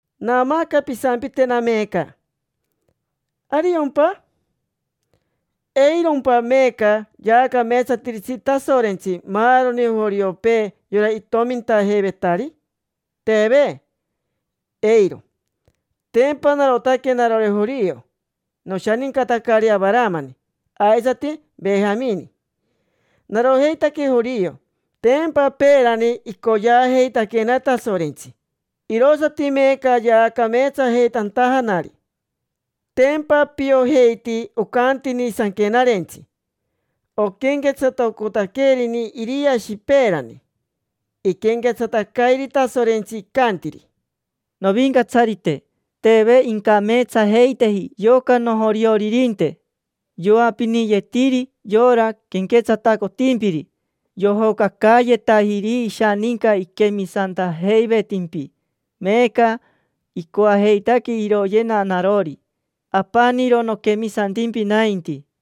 Naamaaca pisampitena meeca: “¿Ariompa? ¿Eirompa meeca yaacameetsatiritsi Tasorentsi maaroni joriopee, yora itomintajeivetari?” Teve, eiro. Tempa narotaque narori jorio. Noshanincatacari Avaramani aisati Vejamini. Narojeitaque jorio. Tempa peerani icoyeajeitaquena Tasorentsi, irosati meeca yaacameetsajeitantajanari. Tempa piojeiti ocantini Sanquenarentsi. Oquenquetsatacotaquerini Iriashi peerani, iquenquetsatacairi Tasorentsi, icantiri: “Novincatsarite, teve incameetsajeiteji yoca nojorioririnte. Yoapiniyetiri yora quenquetsatacotimpiri. Yojocacaayetajiri ishaninca iquemisantajeivetimpi. Meeca icoajeitaque iroyena narori. Apaniro noquemisantimpi nainti”.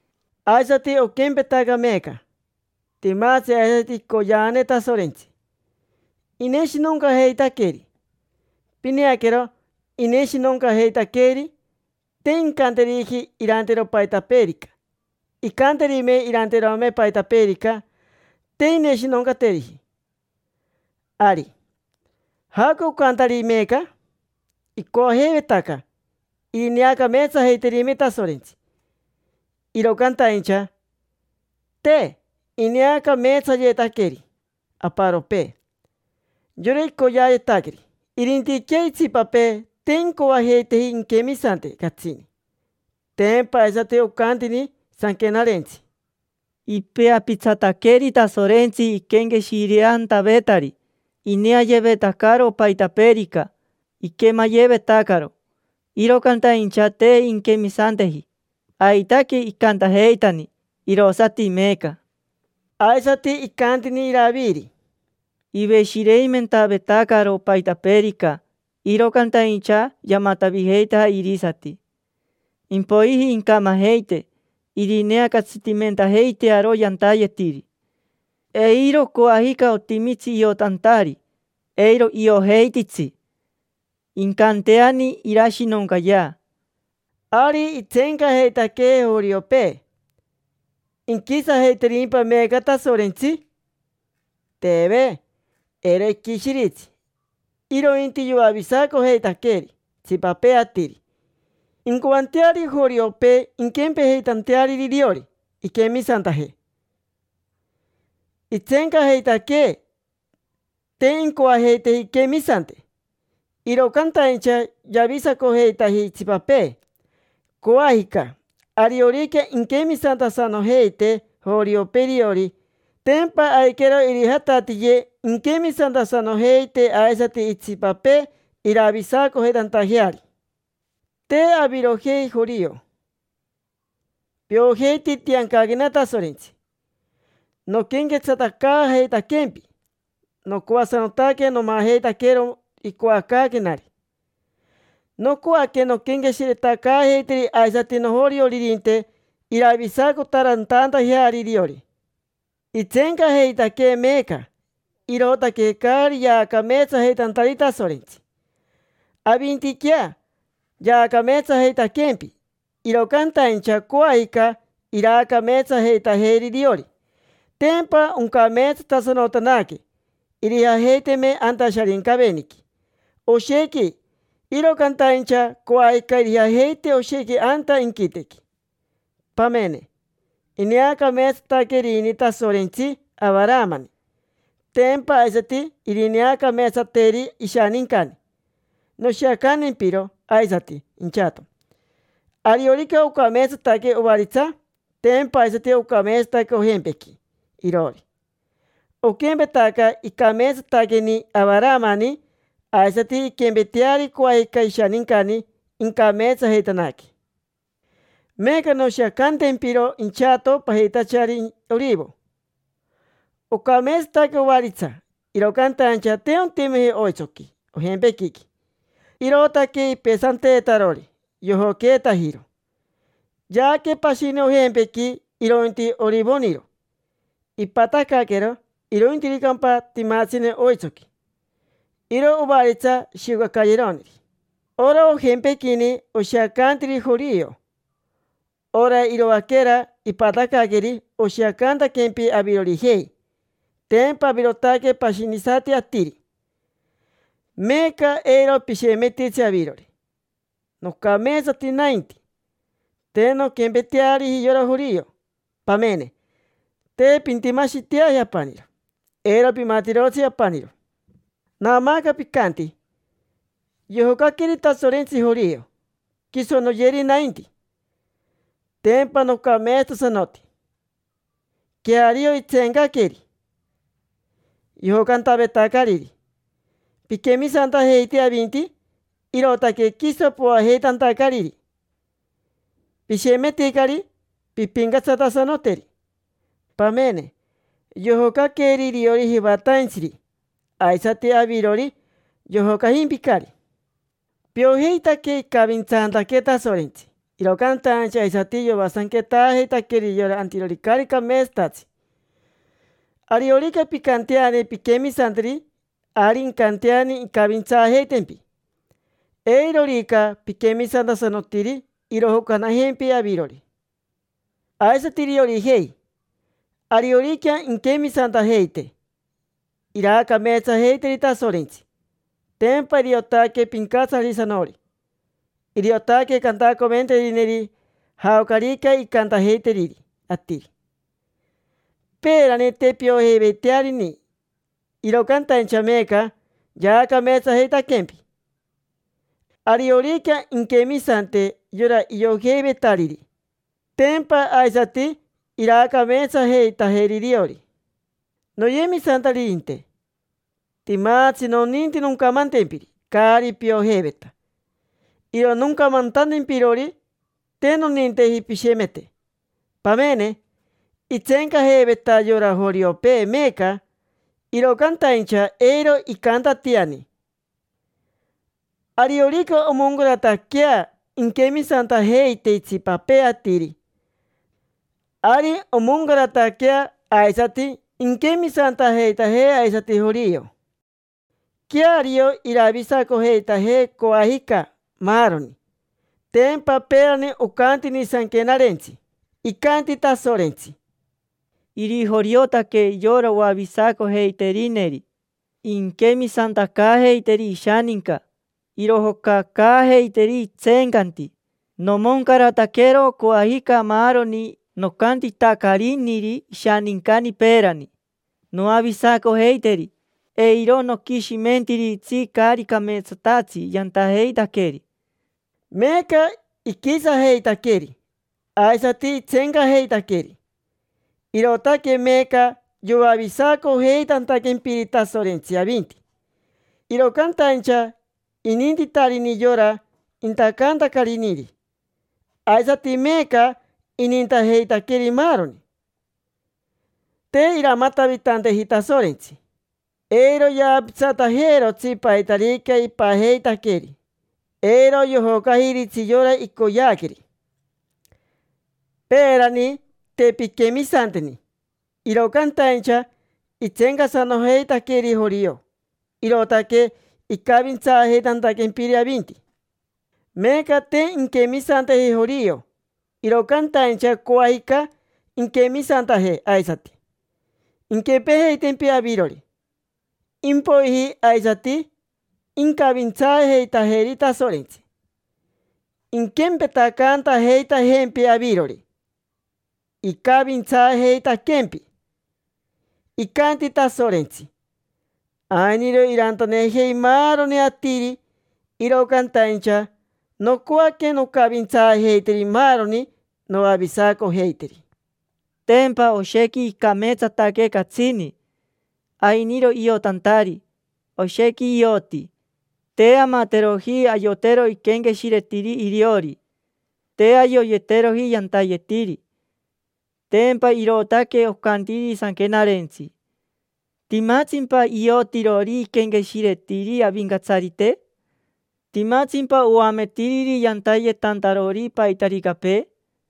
Aisati oquempetaca meeca. Timatsi aisati icoyeane Tasorentsi, ineshinoncajeitaqueri. Pineaquero, ineshinoncajeitaqueri, te incanteriji irantero paitapeerica. Incanterime irantayeterome paitapeerica, te irineshinoncateriji. Ari, ¿jaoca ocantari meeca? Icoajeivetaca irineacameetsajeiterime Tasorentsi, iro cantaincha, te. Ineacameetsayetaqueri aparopee: yora icoyeayetaqueri. Irintiquea itsipapee, te incoajeiteji inquemisante catsini. Tempa aisati ocantini Sanquenarentsi: “Ipeapitsataqueri Tasorentsi iquenqueshireantavetari. Ineayevetacaro paitapeerica, iquemayevetacaro, iro cantaincha te inquemisanteji. Aitaque icantajeitani, irosati meeca”. Aisati icantini Iraviri: “Iveshireimentavetacaro paitapeerica, iro cantaincha yamatavijeitaja irisati. Impoiji incamajeite, irineacatsitimentajeitearo yantayetiri. Eiro coajica otimitsi iotantari, eiro iojeititsi. Incanteani irashinoncayea”. Ari itseencajeitaque joriopee: ¿inquisajeiterimpa meeca Tasorentsi? Teve, eiro iquishiritsi. Irointi yoavisacojeitaqueri itsipapee atiri incoanteari joriopee inquempejeitajeari iriori, inquemisantaje. Itseencajeitaque, te incoajeiteji inquemisante, iro cantaincha yavisacojeitaji itsipapee. Coajica, ariorica inquemisantasanojeite joriopee iriori, tempa aiquero irijatatiye inquemisantasanojeite aisati itsipapee iravisacojeitantajeari. Te avirojei jorio. Piojeiti itiancaquena Tasorentsi noquenquetsatacaajeitaquempi. Nocoasanotaque nomajeitaquero icoacaaquenari. Nocoaque nonquenqueshiretacaajeiteri aisati nojorioririnte, iravisacotaarantantajeari iriori. Itseencajeitaque meeca, irootaque caari yaacameetsajeitantari Tasorentsi; avintiquea yaacameetsajeitaquempi. Iro cantaincha coajica iraacameetsajeitajeri iriori, tempa oncameetsatasanotanaque. Irijajeiteme anta Sharincaveniqui oshequi, iro cantaincha coajica irijajeite oshequi anta inquitequi. Pamene, ineacameetsataquerini Tasorentsi Avaramani, tempa aisati irineacameetsateri ishanincani. Noshiacantempiro aisati inchato: ariorica ocameetsataque ovaritsa, tempa aisati ocameetsataque ojempequi iroori. Oquempetaca icameetsataqueni Avaramani, aisati inquempeteari coajica ishanincani, incameetsajeitanaque. Meeca noshiacantempiro inchato pajitachari orivo. Ocameetsataque ovaritsa, iro cantaincha te ontimeji oitsoqui ojempequiqui. Irootaque ipesanteetarori, yojoqueetajiro. Yaaque pashini ojempequi, irointi orivoniro. Ipatacaaquero, irointiricampa timatsine oitsoqui. Iro ovaritsa shiocacayeroneri. Ora ojempequini oshiacantiri jorio; ora iroaquera ipatacaaqueri oshiacantaquempi avirorijei, tempa avirotaque pashinisati atiri. Meeca eiro pishemetitsi avirori: “Nocameetsati nainti, te nonquempeteariji yora jorio”. Pamene, te pintimashiteaji apaniro, eiro pimatirotsi apaniro. Naamaaca picanti: “Yojocaqueri Tasorentsi jorio, quiso noyeri nainti. Tempa nocameetsatasanoti”. Queario, itseencaqueri, yojocantavetacariri. Piquemisantajeiti avinti, irootaque quiso poajeitantacariri. Pishemeticari, pimpincatsatasanoteri. Pamene, yojocaqueri iriori jivataintsiri, aisati avirori, yojocajimpicari. Piojeitaque icavintsantaque Tasorentsi, iro cantaincha aisati yoasanquetaajeitaqueri yora antirori caari cameetsatatsi. Ariorica pincanteani pinquemisanteri, ari incanteani incavintsaajeitempi. Eirorica piquemisantasanotiri, irojocanajempi avirori. Aisati iriorijei: ariorica inquemisantajeite, iraacameetsajeiteri Tasorentsi, tempa iriotaque Pincatsarisanori. Iriotaque cantacoventerineri jaocarica incantajeiteriri atiri. Peerani te piojeiveitearini, iro cantaincha meeca yaacameetsajeitaquempi. Ariorica inquemisante yora iojeivetariri, tempa aisati iraacameetsajeitajeri iriori. Noyemisantaririnte, timatsi noninti noncamantempiri caari piojeiveta. Iro noncamantantempirori te noninteji pishemete. Pamene, itseencajeiveta yora joriopee meeca, iro cantaincha eiro icantatiani. Ariorica omoncarataquea inquemisantajeite itsipapee atiri, ari omoncarataquea aisati inquemisantajeitaje aisati jorio. Queario iravisacojeitaje coajica, maaroni. Tempa peerani ocantini Sanquenarentsi: “Icanti Tasorentsi: ‘Irijoriotaque yora oavisacojeiterineri, inquemisantacaajeiteri ishaninca, irojocacaajeiteri itseencanti. Nomoncarataquero coajica maaroni nocantitacariniri ishanincani peerani: noavisacojeiteri, eiro noquishimentiritsi caari cameetsatatsi yantajeitaqueri’”. Meeca iquisajeitaqueri, aisati itseencajeitaqueri; irootaque meeca yoavisacojeitantaquempiri Tasorentsi avinti. Iro cantaincha inintitarini yora intacantacariniri, aisati meeca inintajeitaqueri maaroni. Te iramatavitanteji Tasorentsi: eiro yaapitsatajeerotsi paitarica ipajeitaqueeri, eiro yojocajiritsi yora icoyeaqueri. Peerani te pinquemisanteni, iro cantaincha itseencasanojeitaqueri jorio, irootaque icavintsaajeitantaquempiri avinti. Meeca te inquemisanteji jorio, iro cantaincha coajica inquemisantaje aisati, inquempejeitempi avirori. Impoiji aisati incavintsaajeitajeri Tasorentsi, inquempetacaantajeitajempi avirori icavintsaajeitaquempi. Icanti Tasorentsi: “Ainiro irantanejei maaroni atiri, iro cantaincha nocoaque noncavintsaajeiteri maaroni, noavisacojeiteri”. Tempa oshequi icameetsataque catsini. Ainiro iotantari, oshequi ioti. Te amateroji ayotero iquenqueshiretiri iriori, te ayoyeteroji yantayetiri. Tempa irootaque ocantiri Sanquenarentsi: “¿Timatsimpa iotirori iquenqueshiretiri Avincatsarite? ¿Timatsimpa oametiriri yantayetantarori paitaricapee?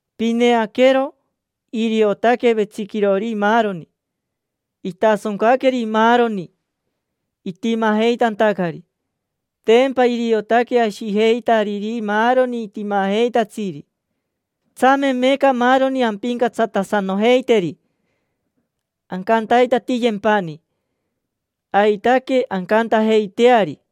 Pineaquero, iriotaque vetsiquirori maaroni. Itasoncaqueri maaroni, itimajeitantacari. Tempa iriotaque ashijeitariri maaroni timajeitatsiri. Tsame meeca maaroni ampincatsatasanojeiteri, ancantaitatiyempani. Aitaque ancantajeiteari.